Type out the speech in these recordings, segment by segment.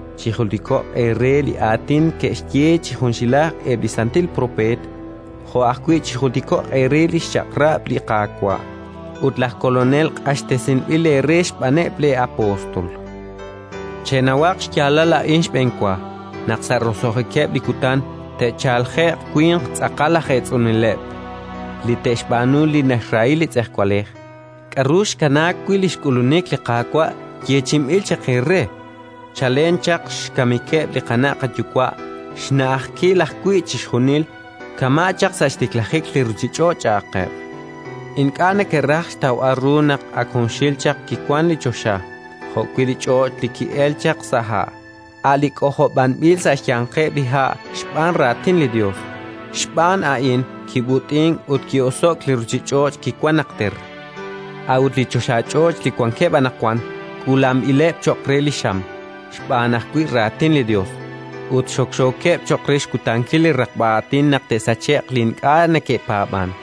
Chijultiko'q eere li aatin ke'xye chi junxilaj eb' li santil propeet, jo' ajwi' chijultiko'q eere li xchaq'rab' li Qaawa' ut laj Kolonel, q'axtesinb'il eere xb'aaneb' lee'apóstol. Chenawaq xyaalal a'in xb'enwa: naq sa' roso'jikeb' li kutan te'chalje'q winq tz'aqal aj eetz'uneleb', li te'xb'aanu li naxrahi li tz'ejwalej: “K'aru xkanaak wi' li xk'ulunik li Qaawa' yeechi'inb'il chaq eere? Chalen chaq xkamikeb' li qana' qayuwa' xna'ajkil ajwi' chixjunil, kama' chaq sa' xtiklajik li ruuchich'och'”, cha'qeb'. Ink'a' neke'raj xtawb'al ru naq ak junxil chaq kiwank li choxa jo'wi' li ch'och' li ki'elk chaq sa' ha', a' li k'ojob'anb'il sa' xyanqeb' li ha' xb'aan Raatin li Yos. Xb'aan a'in kib'ut'in ut ki'oso'k li ruuchich'och' kiwank najter. A'ut li choxach'och' li wankeb' anaqwan k'uulanb'ileb' cho'q re li xam xb'aan ajwi' Raatin li Yos, ut xokxookeb' cho'q re xkutankil li raqb'a aatin naq te'sache'q li ink'a' neke'paab'ank.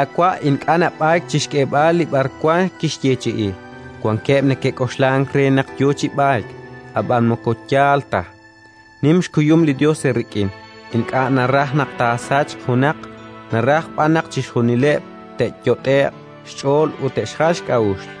Li Qaawa' ink'a' nab'ayk chi xk'eeb'al li b'arwan kixyeechi'i. Wankeb' neke'k'oxlank re naq yo chi b'ayk, ab'an moko yaal ta. Nim xkuyum li Yos eerik'in; ink'a' naraj naq taasachq junaq, naraj b'an naq chixjunileb' te'yot'e'q xch'ool ut te'xjal xk'a'uxl.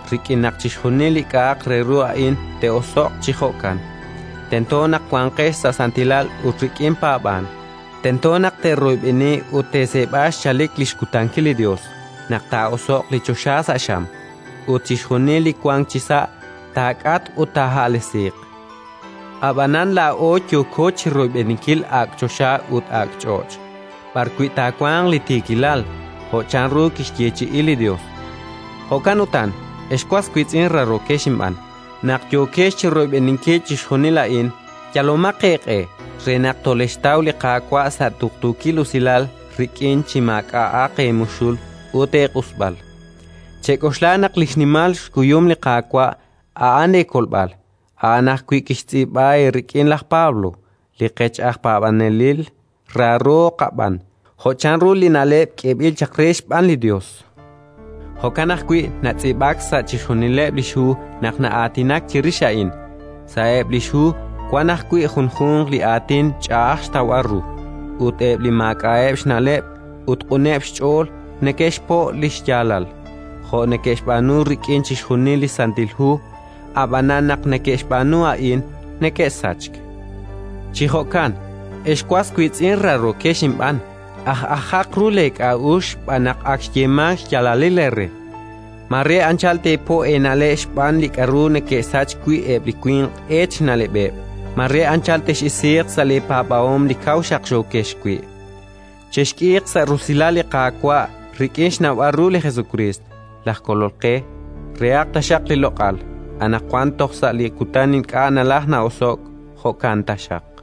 Rik'in naq chixjunil li k'a'aq re ru a'in te'oso'q chi jo'kan, tento naq wanqex sa' santilal ut rik'in paab'ank; tento naq teeroyb'eni ut teeseeb'a xchalik li xkutankil li Yos naq taa'oso'q li choxa sa' xam, ut chixjunil li wank chisa' taak'atq ut taaha'lesiiq. Ab'anan laa'o yooko chi royb'eninkil ak' choxa ut ak' ch'och', b'arwi' taawanq li tiikilal, jo' chanru kixyeechi'i li Yos. Jo'kan utan, ex was wiitz'in raarookex inb'aan, naq yookex chi royb'eninkil chixjunil a'in, yalomaq eeq'e re naq tolexxtaw li Qaawa' sa' tuqtuukil usilal rik'in, chi maak'a'aq eemuxul ut eeq'usb'al. Chek'oxla naq li xnimal xkuyum li Qaawa' a'an leekolb'al. A'an ajwi' kixtz'iib'a eerik'in laj Pablo, li qech aj paab'anelil raaro qab'aan, jo' chanru li na'leb' k'eeb'il chaq re xb'aan li Yos. Jo'kan ajwi' natz'iib'ak sa' chixjunileb' li xhu naq na'aatinak chirix a'in. Sa'eb' li xhu wank ajwi' junjunq li aatin ch'a'aj xtawb'al ru, ut eb' li maak'a'eb' xna'leb' ut q'uneb' xch'ool neke'xpo' li xyaalal (jo' neke'xb'aanu rik'in chixjunil li Santil Hu). Ab'an naq neke'xb'aanu a'in, neke'sachk. Chi jo'kan, ex was wiitz'in raarookex inb'aan, aj'ajaq ru leek'a'uxl xb'aan naq ak xyeemank xyaalalil eere. Mare anchal teepo' eena'leb' xb'aan li k'aru neke'sachk wi' eb' li winq eet xna'leb'eb'; mare anchal tex'isiiq sa' leepaab'ahom li kaw xaqxookex wi'. Chexk'iiq sa' rusilal li Qaawa' rik'in xnawb'al ru li Jesukriist, laj Kolol qe. Rehaq taxaq li loq'al, anaqwan toj sa' li kutan ink'a' nalajk na'oso'k. Jo'kan taxaq.